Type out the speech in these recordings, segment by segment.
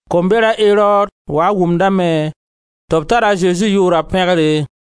Komber, a Erod, waa n wʋmdame tɩ b tar a Zezi yʋʋra pẽgre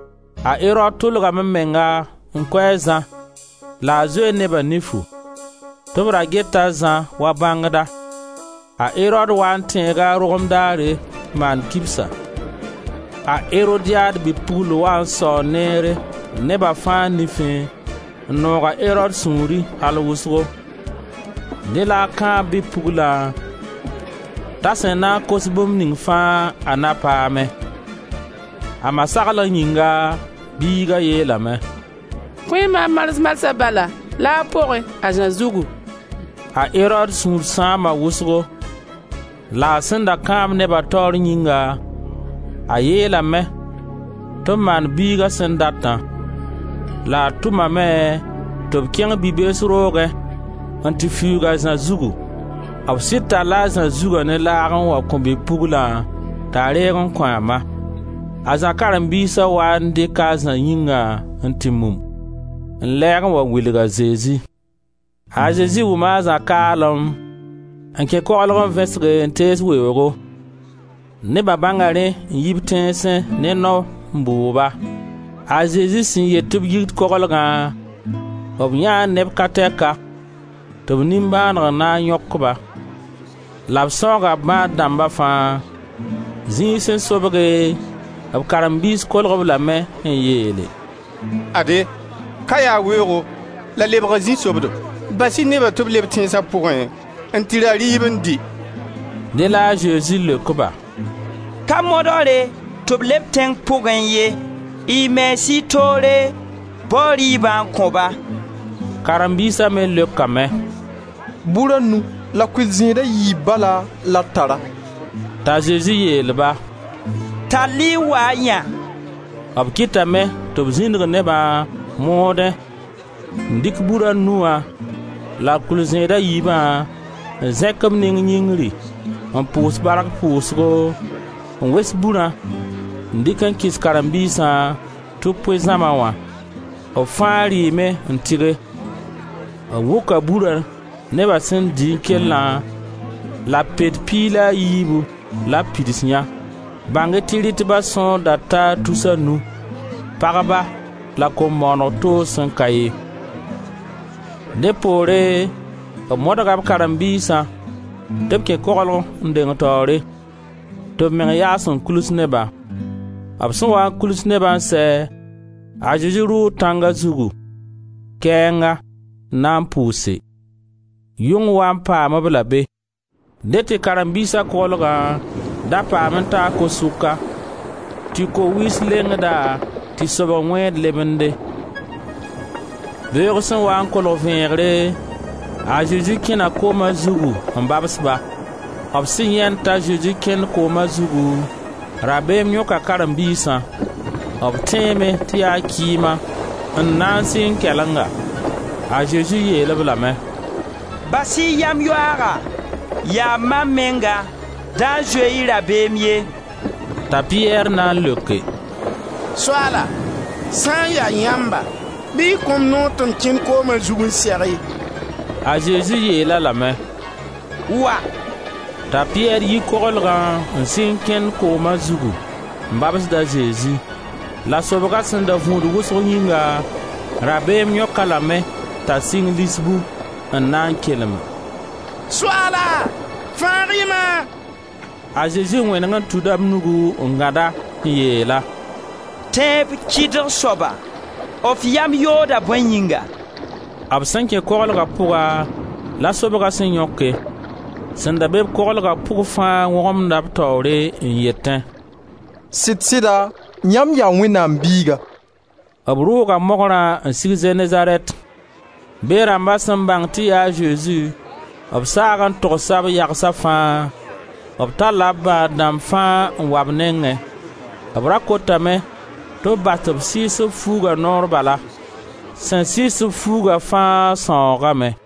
A Erod tʋlgame meng n kʋ a Zã la a zoe neba nifu, tɩ b ra geta a Zã wa bãngda. A Erod waa n tẽega a rogem daare n maan kibsa. A Erodiad bi-pugl waa n saoo neere neba fãa nifẽ n noog a Erod sũuri al wʋsgo. Dẽ la a kãab bi-pugla t'a sẽn na n kos bũmb ning fãa a na paame. A ma saglg yĩnga, biiga yeelame: «Kõ-y maam mars marsã bala, laag pʋgẽ, a Zã zugu.» A Erod sũur sãama wʋsgo la a sẽn da kãab neba taoor yĩnga, a yeelame tɩ b maan biiga sẽn datã la a tʋmame tɩ b kẽng bi-bees roogẽ, n tɩ fiuug a Zã zugu. B sɩd talla a Zã zuga ne laag n wa kõ bi-puglã t'a reeg n kõ a ma. A Zã karen-biisã n waa n dɩk a Zã yĩngã n tɩ mum, n lɛɛg n wa wilg a Zezi. A Zezi wʋma a Zã kaalem, n kẽ koglg, n vẽsge, n tees weoogo. Neba bãnga rẽ n yi b tẽnsẽ ne nao n bʋʋg-ba. A Zezi sẽn yet tɩ b yit koglgã, b yãee neb ka tɛka, tɩ b nimbãaneg na n yõk-ba. La b sãooga bãad dãmba fãa. Zĩig sẽn sobge b karen-biis kolg-b lame n yeele: «Ade, ka yaa weoogo la lebga zĩ-sobdo. Bas-y neba tɩ b le b tẽnsa pʋgẽ n tɩ ra rɩɩb n dɩ.» Dẽ la a Zezi leok-ba: «Ka modgre tɩ b leb tẽng pʋgẽ ye, y mens y toore bao rɩɩbã n kõ-ba.» Karen-biisa me leokame: «Bur a nu la kʋɩl-zẽed a yiib bala la d tara.» T'a Zezi yeel-ba: «Tall-y n wa-y yã.» B kɩtame tɩ b zĩndig nebã, moodẽ, n dɩk bur a nu wã la kʋɩl-zẽed a yiibã n zẽk b neng yĩngri, n pʋʋs bark pʋʋsgo, n wes burã n dɩk n kɩs karen-biisã tɩ b pʋɩ zãma wã. B fãa rɩɩme n tɩge. B wʋka burã neba sẽn dɩ n kellã la pet piig la a yiibu la b pids yã. Bãng-y tɩ rɩtba sõor da taa tus a nu, pagba la kom-bõonega toog sẽn ka ye. Dẽ poore b modga b karen-biisã tɩ b kẽ koglg n deng taoore, tɩ b meng yaas n kuls nebã. B sẽn waa n kuls nebã n sɛ, a Zezi rʋʋ tãnga zugu, kɛɛnga, n na n pʋʋse; yʋng waa n paam-b-la be. Dẽ tɩ karem-biisa koglgã da paam n taa ko-sʋka tɩ ko-wiis lengd-a, tɩ sobg wẽed lebende. Beoog sẽn waa n kolg vẽegre, a Zezi kẽna kooma zugu n babs-ba. B sẽn yãend t'a Zezi kẽnd kooma zugu, rabeem yõka karen-biisã; b tẽeme tɩ yaa kɩɩma, n na n sɩng kɛlenga. A Zezi yeel-b lame: «Bas-y yam-yoaaga, yaa mam menga, da zoe-y rabeem ye!» T'a Piyɛr na n leoke: «Soaala sã n ya yãmba, bɩ y kõ-m noor tɩ m kẽn kooma zug n seg-y.» A Zezi yeel-a lame: «Wa!» T'a Piyɛr yi koglgã n sɩng kẽnd kooma zugu n babsd a Zezi. La sobga sẽn da vũud wʋsg yĩnga rabeem yõk-a lame t'a sɩng lisbu, n na n kelem: «Soaala, fãag-y-ma.» A Zezi wẽneg n tuda b nugu n gãd-a, n yeel-a: «Tẽeb kɩdg soaba, f yam yooda bõe yĩnga?» B sẽn kẽ koglga pʋga la sobga sẽn yõke. Sẽn da be-b koglga pʋg fãa wõgemda b taoore n yetẽ: «Sɩd-sɩda yãmb yaa Wẽnnaam Biiga.» B rʋʋga mogrã n sig Zenezarɛt. Be rãmba sẽn bãng tɩ yaa a Zezi, b saag n togsa b yagsa fãa. B talla b bãad dãmb fãa n wa b nengẽ. B ra kotame tɩ b bas tɩ b sɩɩs b fuuga noor bala. Sẽn sɩɩs-b fuuga fãa sãoogame.